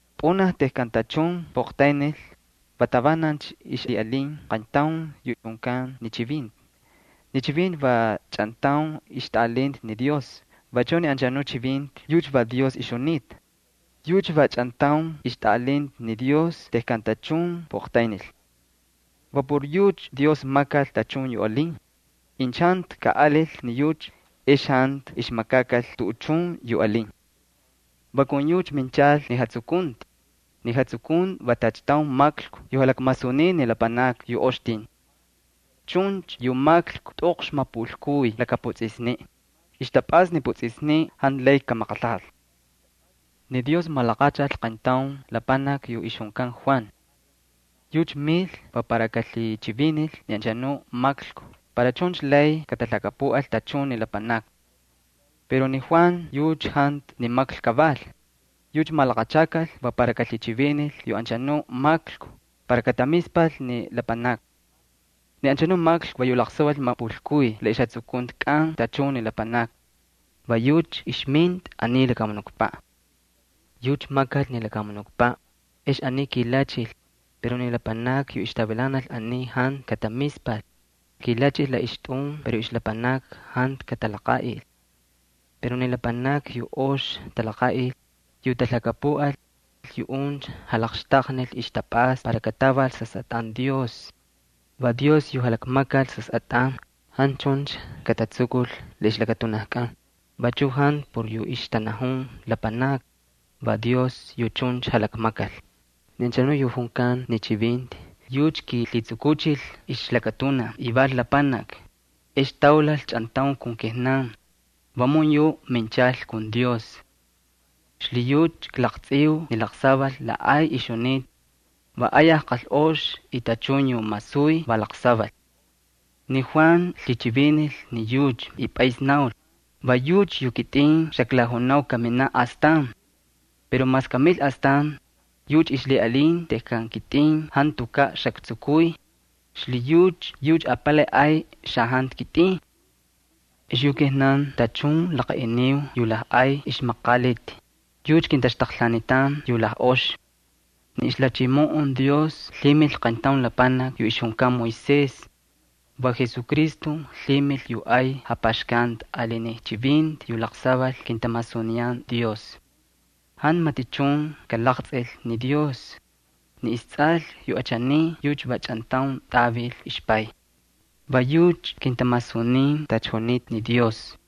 Pꞌunaj tejkan tachun puꞌaqtaynil, va tavanancha ixlhiꞌalin qayntaun yu junkan ni Chivinti. Ni Chivinti va chꞌantaun ixtꞌaꞌalinta ni Dios, vachu ni anchanuꞌ Chivinti yucha va Dios ixjunita. Yucha va chꞌantaun ixtꞌaꞌalinta ni Dios tejkan tachun puꞌaqtaynil. Va por yucha Dios makal tachun yu alin. Incha jantu kaꞌalil ni yucha, ex jantu ixmakakal tuꞌuchun yu alin. Va kun yucha minchal ni jatsukunti. Ni jatsukunti va tacha taun maklku yu jalakmasuniy ni lapanakni yu ox tin. Chuncha yu maklku tꞌoqx mapulkuy laka putsꞌisniꞌ. Ixtapꞌasta ni putsꞌisniꞌ jantu lay kamaqalhajal. Ni Dios malaqachal qayntaun lapanaki yu ixjunkan Juan. Yucha mil va para kalhichivinil ni anchanu maklku para chuncha lay katalhakapuꞌal tachun ni lapanakni. Pero ni Juan yucha jantu ni maklku kaval. Yucha malaqachakal va para kalhichivinil yu anchanuꞌ maklku para katamispal ni lapanakni. Ni anchanuꞌ maklku va yu laqsaval mapulkuy la ixjatsukuntikꞌan tachun ni lapanakni. Va yucha ixminta aniy lakamunukpaꞌ. Yucha makal ni lakamunukpaꞌ, ex aniy kilachil, pero ni lapanakni yu ixtavilanal aniy jantu katamispal. Kilachil la ixtꞌun pero ixlapanakni jantu katalaqaꞌil. Pero ni lapanakni yu ox talaqaꞌil, yu talhakapuꞌal, yuꞌuncha jalaqxtaqnil ixtapꞌasta para kataval sasꞌatꞌan Dios. Va Dios yu jalakmakal sasꞌatꞌan. Jantu chuncha katatsukul la ixlakatunajkꞌan. Vachuꞌ jantu por yu ixtanajun lapanakni. Va Dios yu chuncha jalakmakal. Ni anchanu yu junkan ni Chivinti yucha kiilhitsukuchil ixlakatunaj y val lapanaki, ex taulal chꞌantaun kun kijnan. Vamun yuꞌ minchal kun Dios. Xlhiyucha klaqtsꞌiu ni laqsaval la ay ixjunita. Va ayaj qalꞌox y tachun yu masuy va laqsaval. Ni Juan lhichivinil ni yucha, va pꞌays naul: “Va yucha yu kitꞌin xaklajunau kaminaꞌ astan. Pero mas kamil astan, yucha ixlhiꞌalin tejkan kitꞌin jantukaꞌ xaktsukuy. Xlhiyucha yucha apalay ay xajantu kitꞌin.” Ex yu kijnan tachun laqaꞌiniu yu lajꞌay ixmaqaliti, yucha kintaxtaqlhaanitan yu lajꞌoxi. Ni ixlhachimoꞌon Dios lhimil qayntaun lapanaki yu ixjunkan Moisés. Va Jesucristo lhimil yu ay japaxkanti ali ni chivinti yu laqsaval kintamasuniyan Dios. Jantu matichun kalaqtsꞌil ni Dios. Ni istsꞌal yu achaniy yucha va chꞌantaun tꞌavil ixPay. Va yucha kintamasunin tacha junitacha ni Dios.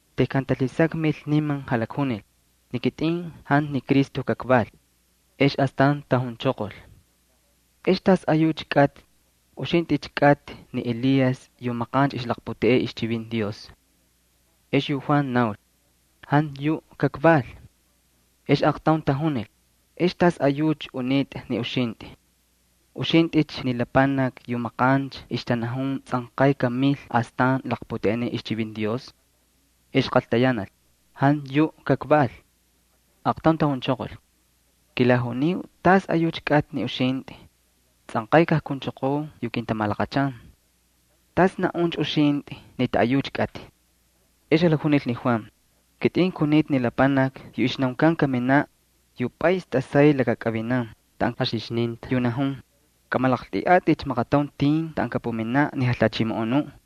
Tejkan talhisakmil, niman jalakjunil: —Ni kitꞌin jantu ni Cristo kakval. Ex astan tajunchoqol: —¿Ex tasꞌayucha kꞌatꞌi? ¿Uxintꞌicha kꞌatꞌi ni Elías yu maqancha ixlaqputeꞌey ixchivinti Dios? Ex yu Juan naul: —Jantu yuꞌ kakval. Ex aaqtaun tajunil: —¿Ex tasꞌayucha unitꞌa ni uxintꞌi? ¿Uxintꞌicha ni lapanaki yu maqancha ixtanajun tsꞌanqay kamil astan laqputeꞌeniꞌ ixchivinti Dios? Ex qaltayanal: —Jantu yuꞌ kakval. Aaqtaun tajunchoqol: —Kilajuniu tasꞌayucha kꞌatꞌi ni uxintꞌi. Tsꞌanqay kajkunchoqoo yu kintamalaqachan. ¿Tas naꞌuncha uxintꞌi ni taꞌayucha kꞌatꞌi? Ex jalakjunil ni Juan: —Kitꞌin kunita ni lapanaki yu ixnaunkan kaminaꞌ, yu pꞌays tꞌasay lakakꞌavinan taꞌan jaxixninta, yu najun: “Kꞌamalaqltꞌiꞌatꞌikcha maqataun tin taꞌan kapuminaꞌ ni Jalhachimoꞌonuꞌ.”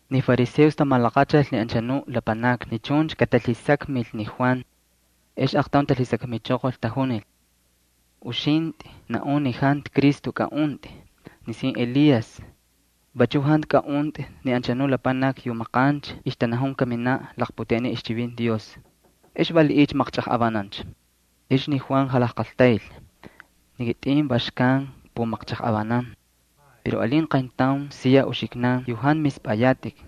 Ni fariseos tamalaqachal ni anchanu lapanakni ni chuncha katalhisakmil ni Juan. Ex aaqtaun talhisakmichoqol, tajunil: —Uxintꞌi naꞌun ni jantu Cristo kaꞌuntꞌi, nisin Elías, vachu jantu kaꞌuntꞌi ni anchanu lapanaki yu maqancha ixtanajun kaminaꞌ laqputeꞌeniꞌ ixchivinti Dios. ¿Ex valiꞌiycha maqchꞌajꞌavanancha? Ex ni Juan va jalajqaltayl: —Ni kitꞌin va xkan kpumaqchajꞌavanan. Pero alin qayntaun siya uxiknan yu jantu mispꞌayatꞌik.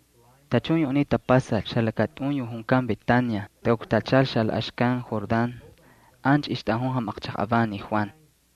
Tachun yu aniy tapasal xalakatꞌun yu junkan Betania takuktachal xalaꞌaxkan Jordán. Ancha ixtꞌajun jamaqchajꞌavan ni Juan.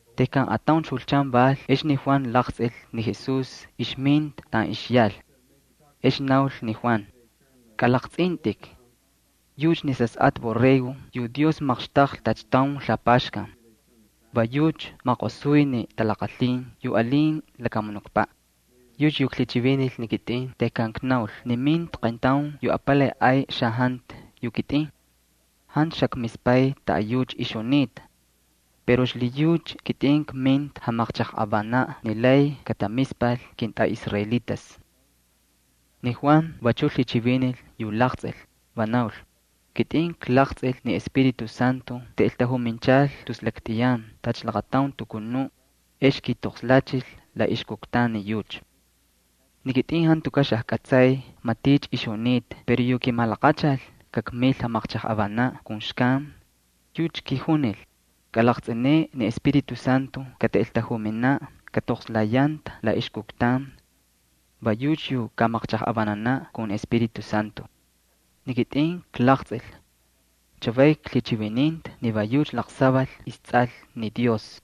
Tejkan atauncha julchan val ex ni Juan laqtsꞌil ni Jesús ixminta taꞌan ixyal. Ex naul ni Juan: —¡Kꞌalaqtsꞌintꞌik! Yucha ni Sasꞌatꞌa borrego yu Dios maqxtaqlhi tacha taun lapaxkan. Va yucha maqosuy ni talaqalhin yu alin lakamunukpaꞌ. Yucha yu klhichivinil ni kitꞌin tejkan knaul ni minta qayntaun yu apalay ay xajantu yu kitꞌin. Jantu xakmispay taꞌayucha ixjunita. Pero xlhiyucha kitꞌin kminta jamaqchajꞌavanaꞌ ni lay katamispal kintꞌaꞌisraelitas. Ni Juan vachu naul: —Kitꞌin klaqtsꞌil ni Espíritu Santo taꞌeltajuminchal tus laktꞌiyan tacha laqataun palumax, ex kiitoqslachil la ixkuktan ni yucha. Ni kitꞌin jantukaꞌ xajkꞌatsay maticha ixjunita pero yu kimalaqachal kakmil jamaqchajꞌavanaꞌ kun xkan, yucha kijunil: “Kꞌalaqtsꞌineꞌe ni Espíritu Santo kataꞌeltajuminaꞌ, katoqslayanta la ixkuktan. Va yucha yu kamaqchajꞌavananaꞌ kun ni Espíritu Santo.” Ni kitꞌin klaqtsꞌil. Chavay klhichivininta ni va yucha laqsaval Sasꞌatꞌa Dios.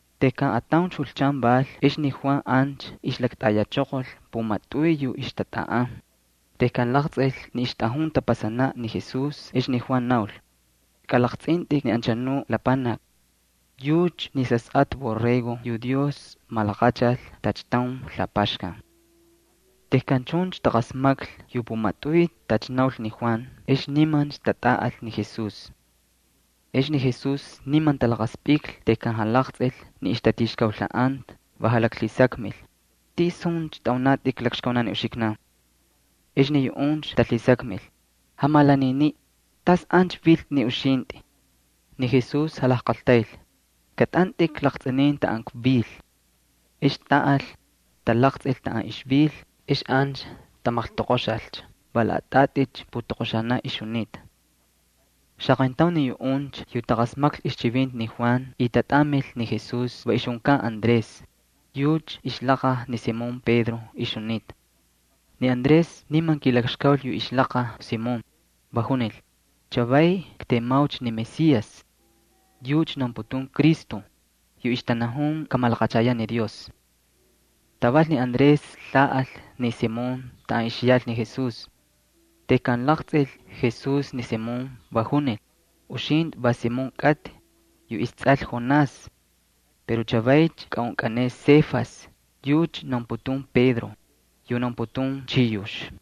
Tejkan atauncha julchan val ex ni Juan ancha ixlaktayachoqol pumatꞌuy yu ixtatꞌaꞌan. Tejkan laqtsꞌil ni ixtꞌajun tapasanaꞌ ni Jesús ex ni Juan naul: —Kꞌalaqtsꞌintꞌik ni anchanu lapanaki. Yucha ni Sasꞌatꞌa borrego yu Dios malaqachal tacha taun lapaxkan. Tejkan chuncha taqasmaklhi yu pumatꞌuy tacha naul ni Juan ex nimancha tatꞌaꞌal ni Jesús. Ex ni Jesús niman talaqaspꞌiklhi tejkan jalaqtsꞌil ni ixtatixkaulhaꞌanta. Va jalaklhisakmil: —¿Tisuncha tꞌaunatꞌikcha lakxkaunan ni uxiknan? Ex ni yuꞌuncha talhisakmil: —Jamalaniniꞌ, ¿tas ancha viltꞌi ni uxintꞌi? Ni Jesús jalajqaltayl: —Kꞌatꞌantꞌik laqtsꞌinin taꞌan kvil. Ex taꞌal, talaqtsꞌil taꞌan ixvil. Ex ancha tamaqltoqoxalcha, va laꞌatꞌaticha putoqoxata ixjunita. Xaqayntaun ni yuꞌuncha yu taqasmaklhi ixchivinti ni Juan y tatꞌamil ni Jesús va ixjunkan Andrés, yucha ixlaqaj ni Simón Pedro ixjunita. Ni Andrés niman kiilakxkaul yu ixlaqaj Simón, va junil: —Chavay ktemaucha ni Mesías. (Yucha naunputun Cristo, yu ixtanajun kamalaqachayaꞌ ni Dios.) Taval ni Andrés lhaꞌal ni Simón taꞌan ixyal ni Jesús. Tejkan laqtsꞌil Jesús ni Simón, va junil: —Uxintꞌi va Simón kꞌatꞌi, yu istsꞌal Jonás. Pero chavaycha kaꞌunkꞌaneꞌe Cefas (yucha naunputun Pedro, yu naunputun Chiyux).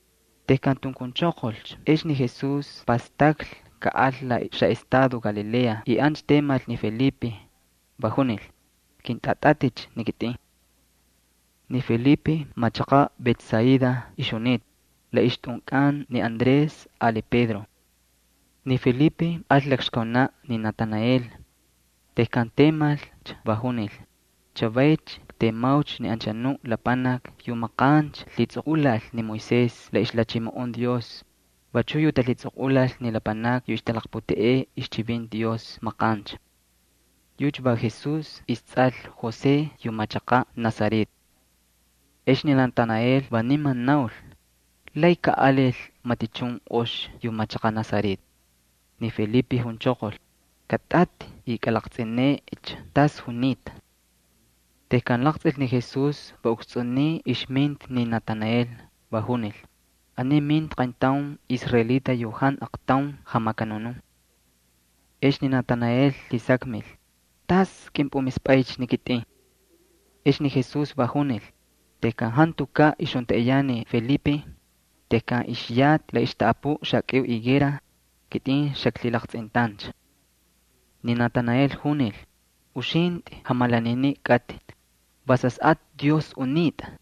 Tejkan tunkunchoqolcha ex ni Jesús pastaklhi kaꞌal la xaꞌestado Galilea. Ancha temal ni Felipe, va junil: —Kꞌintꞌatꞌatꞌicha ni kitꞌin. Ni Felipe va machaqaꞌ Betsaida ixjunita, la ixtꞌunkꞌan ni Andrés ali Pedro. Ni Felipe al lakxkaunaꞌ ni Natanael. Tejkan temalcha va junil: —Chavaycha ktemaucha ni anchanu lapanaki yu maqancha lhitsꞌoqꞌulal ni Moisés la ixlhachimoꞌon Dios, vachuꞌ yu talhitsꞌoqꞌulal ni lapanakni yu ixtalaqputeꞌey ixchivinti Dios maqancha. Yucha va Jesús istsꞌal José yu machaqaꞌ Nazaret. Ex ni Natanael va niman naul: —¿Lay kaꞌalil matichun ox yu machaqaꞌ Nazaret? Ni Felipe junchoqol: —Kꞌatꞌatꞌi y kꞌalaqtsꞌineꞌecha tas junita. Tejkan laqtsꞌil ni Jesús va ukstsꞌuniy ixminta ni Natanael va junil: —Aniy minta qayntaun israelita yu jantu aqtaun jamakanunun. Ex ni Natanael lhisakmil: ¿Tas kꞌimpꞌumispꞌaycha ni kitꞌin? Ex ni Jesús va junil: —Tejkan jantukaꞌ ixjuntaꞌiyan ni Felipe, tejkan ixyatꞌi la ixtaꞌapuꞌ xakꞌiu higuera, kitꞌin xaklhilaqtsꞌintancha. Ni Natanael junil: —Uxintꞌi jamalaniniꞌ kꞌatꞌi, va Sasꞌatꞌa Dios unitꞌa,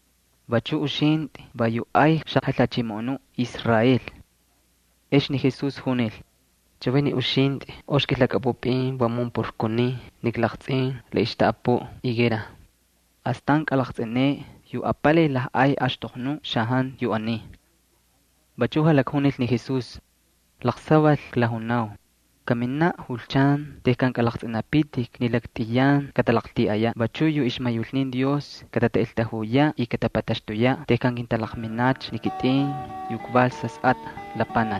vachu uxintꞌi va yu ay xaJalhachimoꞌonuꞌ Israel. Ex ni Jesús junil: —Chavay ni uxintꞌi ox kꞌilhakꞌapꞌupꞌin vamun por kunin ni klaqtsꞌin la ixqaltaꞌapuꞌ higuera. Astan kꞌalaqtsꞌineꞌe yu apalay lajꞌay axtoqnu xajantu yu aniy. Vachuꞌ jalakjunil ni Jesús: —Laqsaval klajunau, kaminaꞌ julchan tejkan kꞌalaqtsꞌinapitik ni laktꞌiyan katalaqltiꞌayaꞌ, vachu yu ixmayulnin Dios katataꞌeltajuyaꞌ y katapataxtuyaꞌ tejkan kintalaqminacha ni kitꞌin yu kval Sasꞌatꞌa Lapanaki.